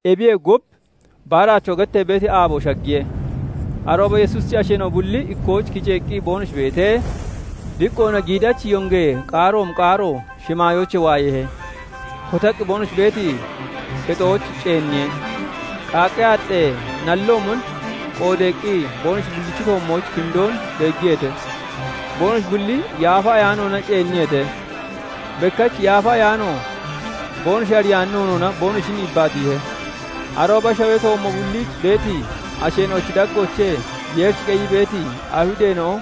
Ebiyee gub, baaraachoo gettee beeti aabo shaggiye. Arooba Yesuusichi asheena'o bulli ikkooch kiceeqqi boonoshi beetee, diqqoona giiddachi yongee qaaroomi qaaro shimaayoochee waayeehe; kotaqqi boonoshi beeti kexooch ceenniye. Qaaqqee aaxxee nalloomon qoodeeqqi, boonoshi bullichi toommooch kindoon beeggiyeete. Boonoshi bulli Yaafa Ayaanoona ceenniyeete; bekkach Yaafa Ayaano boonoshi ariyaani noonoona boonoshin yibbaatiihe. Arooba shawee toommo bulliich beeti asheena'ochi daggoochee Yeerich qeyii beeti Ayihudeena'o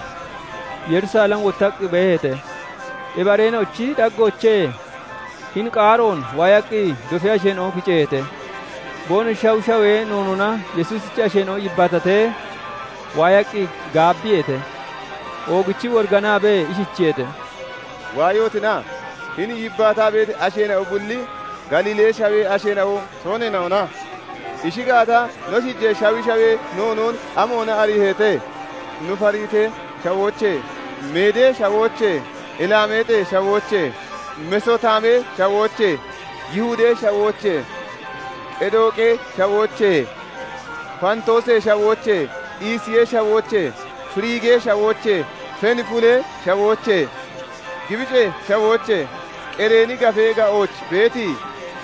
Yerusalem wottaqqi beeheete. Ebi areena'ochi daggoochee hini qaaroon waayaqqi dofee asheena'o kiceeheete. Boonoshi shawi shawee noonoona Yesuusichi asheena'o yibbaatatee waayaqqi gaabbiyeete. Oogichii woriganaabee ishichiyeete:- "Waayotina? Hini yibbaataa beeti asheena'o bulli Galiilee Shawee asheena'o tooneena'ona? Ishi gaata, no shiijee shawi shawee noonoon amoona ariiheete? No Faaritee Shawoochee, Meedee Shawoochee, Ilaameexee Shawoochee, Mesotaamee Shawoochee, Yihudee Shawoochee, Qedooqee Shawoochee, Faantoosee Shawoochee, Isiyee Shawoochee, Firigee Shawoochee, Fenfulee Shawoochee, Gibicee Shawoochee, Qereeni Gafee ga'ooch beeti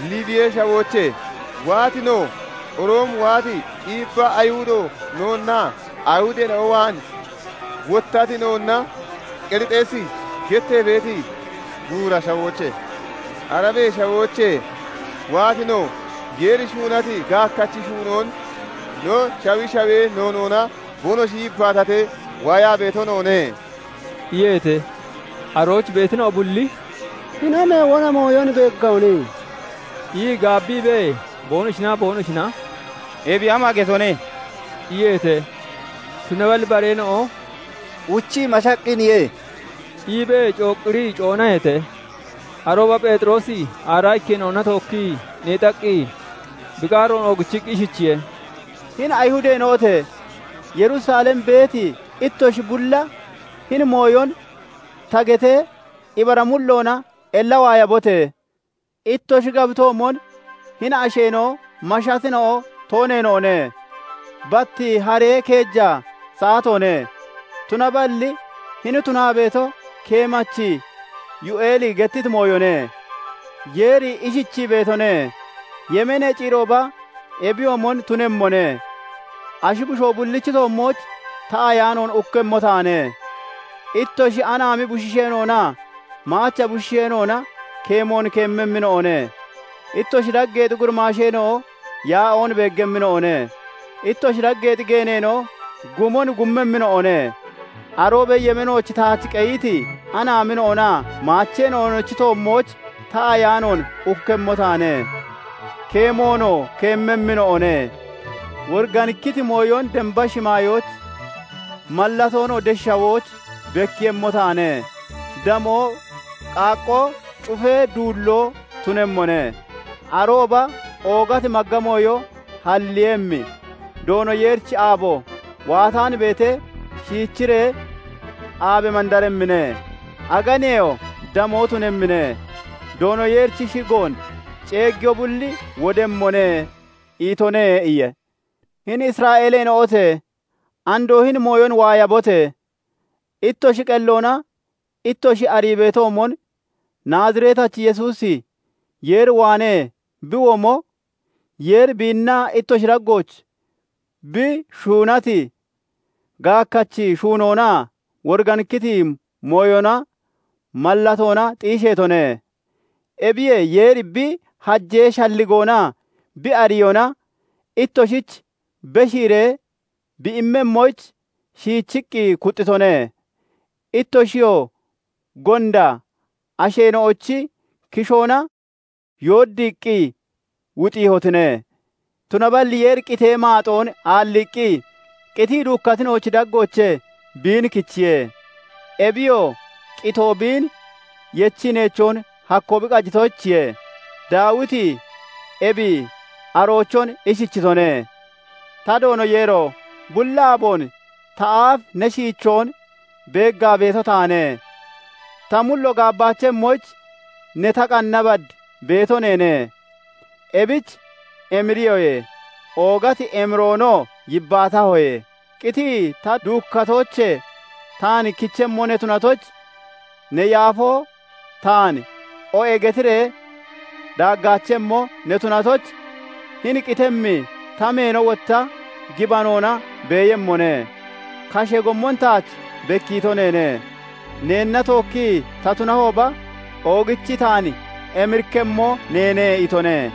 Liibiyee Shawoochee waati no, Roomee waati iibba Ayihudo noonnaa Ayihudeena'o waan wottati noonna, Qerixeesi gettee beeti buura shawoochee, Arabee Shawoochee waati no, Yeeri shuunati gaakkachi shuunoon no shawi shawee noonoona boonoshi yibbaatatee waayaa beeto noone" iyeete. Arooch beetina'o bulli "Hini amee wona mooyon beeggahone?" ii gaabbiibee, boonoshinaa boonoshina "Ebi ama getone?" iyeete. Tunaballi bareena'o "Uchii mashaqqiniye" iibee cooqqirii coonaheete. Arooba Pheexiroosi aaraa ikkeena'ona tookkii neexaqqi, bi qaaroon oogichiqqi ishichiye:- "Hini Ayihudeena'ote! Yerusalem beeti ittoshi bulla! Hini mooyon ta getee, ibara mulloona ella waayabote! Ittoshi gabitoomon hini asheena'o mashatina'o tooneena'one. Bat haree keeja saatoone. Tunaballi hini tunaa beeto, keemachi Yoo'eeli gettiti mooyone:- 'Yeeri ishichii beetone:- "Yemeenee ciirooba ebiyoomon tunemmone; ashi bushoo bullichi toommooch ta Ayaanoon ukkemmo taane; ittoshi anaami bushiishoonaa maacha bushiishoona keemoon keemmemmina'one; ittoshi daggeexi gurimaasheena'o yaa'oon beeggemmina'one; ittoshi daggeexi geeneena'oo gumon gummemmina'o ne. Aroobee yemeenooch taach qeyiti anaamina'onaa maacheena'onochi toommooch, ta Ayaanoon ukkemmo taane; keemoonoo keemmemmina'o ne. Woriganikkiti mooyon damba shimaayooch, mallatoonoo desh shawooch bekkiiyemmo taane; damoo, qaaqqoo, cufee duulloo tunemmone. Arooba oogati magga mooyo halleeyemmi, Doono Yeerichi aabo waataan beetee shiichiree, aabe mandaremmine; aganeyoo damoo tunemmine. Doono Yeerichi shigoon ceeggiyo bulli wodemmone" itone' iye. "Hini Isra'eeleena'ote! Andoo hini mooyon waayabote! Ittoshi qelloona ittoshi arii beetoomon, Naaziretachi Yesuusi Yeer waanee bi womo, Yeeri biinna ittoshi daggooch bi shuunati gaakkachi shuunoona, woriganikkiti mooyonaa mallatoona xiisheetone. Ebiyee Yeeri bi hajee shalligoonaa bi ariyoona ittoshich beshiiree bi immemmoyich shiichiqqi kuxxitone; ittoshiyoo gonda asheena'ochi kishoona yooddiiqqi wuxiihotine. Tunaballi Yeeri qitee maaxoon aalliiqqi, qitii duukkatina'ochi daggoochee biin kichiye; Ebiyoo qitoo biin yechii neechoon hakkoo bi qajitoyichiye. Daawiti ebi aroochon ishichitone:- 'Ta Doono Yeero! Bulli aaboon ta aaf ne shiichoon beeggaa beeto taane; ta mullo gaabbaachemmoyich, ne ta qanna bad beeto neene. Ebich emiriyoye; oogati emiroonoo yibbaatahoye. Qitii ta duukkatoochee taan kichemmo ne tunatoyich, ne yaafoo taan "O'e" getiree daaggaachemmo ne tunatoyich, hini qitemmi ta meeno wotta gibanoona beeyemmone. Kashee gommon taach bekkiito neene; neenna tookki ta tunahooba, oogichi taan emirikkemmo neene' itone.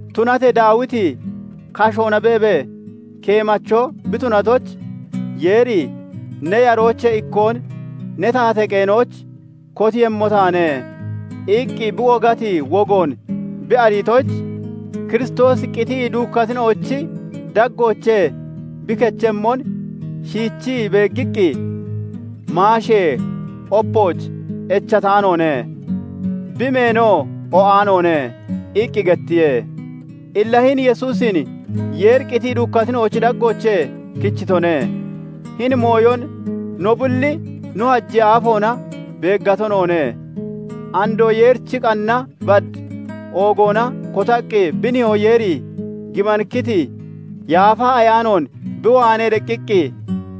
Tunatee Daawiti kashoona beebee, keemacho bi tunatoyich, Yeeri 'Ne yaroochee ikkoon ne taatee qeenooch kotiiyemmo taane' iqqi bi wogati wogoon bi ariitoyich, Kiristoosi qitii duukkatina'ochi daggoochee bi kechemmon shiichii beeggiqqi, 'Maashee opooch echataanoone; bi meenoo o'aanoone' iqqi gettiye. Illa hini Yesuusin Yeeri qitii duukkatina'ochi daggoochee kichitone; hini mooyon no bulli no hajee aafoona beeggato noone. Andoo Yeerichi qanna bad oogoona kotaqqi bi Nihoo Yeeri gibanikkiti Yaafa Ayaanoon bi waanee deqqiqqi,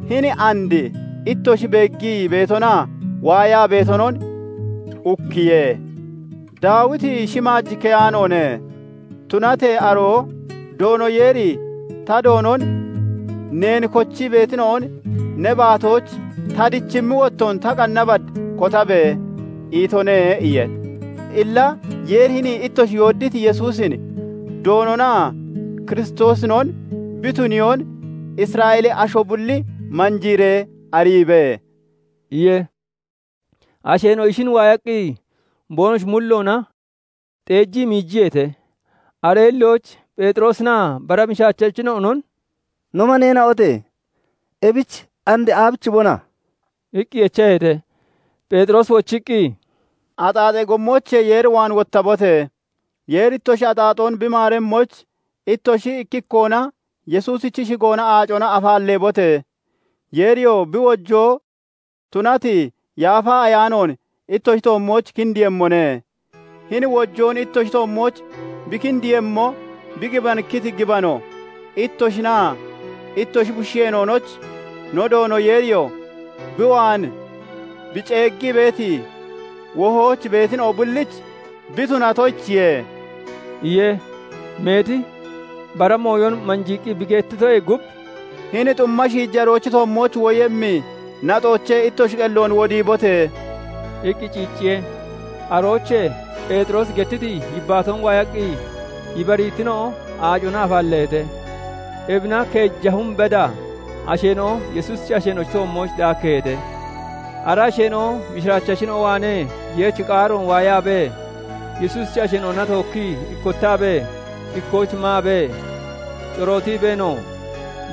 hini and ittoshi beeggii beetonaa waayaa beetonon ukkiye. Daawiti shimaaj keyaanoone; tunatee aroo 'Doono Yeeri ta Doonon "Neen kochii beetina'on ne baatooch ta dichimmi wottoon, Ta qanna bad kotabe!" itone' iye. "Illa Yeeri hini ittoshi yooddiiti Yesuusin Doononaa Kiristoosinon bi tuniyoon Isra'eelee asho bulli manjiiree ariibe" iye. Asheena'o ishin waayaqqi, boonoshi mulloona xeejii miijiyeete. Aree hillooch Pheexiroosinaa bara mishiraachachina'onon "No maneena'ote! Ebich and aabichibona?" iqqi echaheete. Pheexiroosi wochiqqi, "Axaaxee gommoochee Yeer waan wottabote! Yeeri ittoshi axaaxoon bi maaremmoyich, ittoshi ikki ikkoona Yesuusichi shigoona aacona afaalleebote! Yeeriyoo bi wojoo tunati Yaafa Ayaanoon ittoshi toommooch kindiiyemmone. Hini wojoon ittoshi toommooch bi kindiiyemmo, bi gibanikkiti gibano ittoshinaa ittoshi bushiishoonoyich, no Doono Yeeriyoo bi waan bi ceeggii beeti, wohooch beetina'o bullich bi tunatoyichiye" iye. Meeti bara mooyon manjiiqqi bi gettitoyee gub, "Hini xumma shiijaroochi toommooch woyemmi naxoochee ittoshi qelloon wodiibote!" iqqi ciicciye. Aroochee Pheexiroosi gettiti yibbaatoon waayaqqi, ibariitina'o aacona afaalleeheete. Ebina keeja hum beda asheena'o Yesuusichi asheena'o toommooch daakkeeheete. Ara asheena'o mishiraachachina'o waanee Yeerichi qaaroon waayaabee, Yesuusichi asheena'ona tookkii ikkottaabee, ikkooch maabee, corootiibeenoo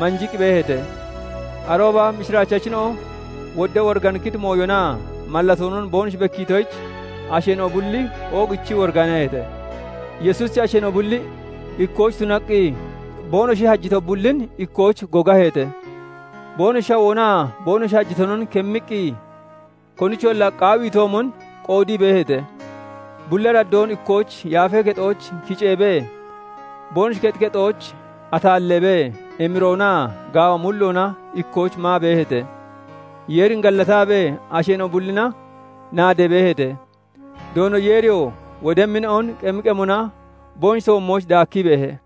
manjiqqi beeheete. Arooba mishiraachachina'o wodda woriganikkiti mooyonaa mallatoonon boonoshi bekkiitoyich asheena'o bulli oogichii woriganaheete. Yesuusichi asheena'o bulli ikkooch tunaqqi, boonoshi hajito bullin ikkooch gogaheete. Boonoshi shawoonaa boonoshi hajitonon kemmiqqi, konicholla qaawiitoomon qoodii beeheete. Bulli araddoon ikkooch Yaafee Kexooch kiceebee, boonoshi kexi kexooch ataalleebee, emiroonaa gaawa mulloona ikkooch maa beeheete; Yeerin gallataabee asheena'o bullina naadee beeheete. Doono Yeeriyoo wodemmina'on qemi qemona boonoshi toommooch daakkii beehe.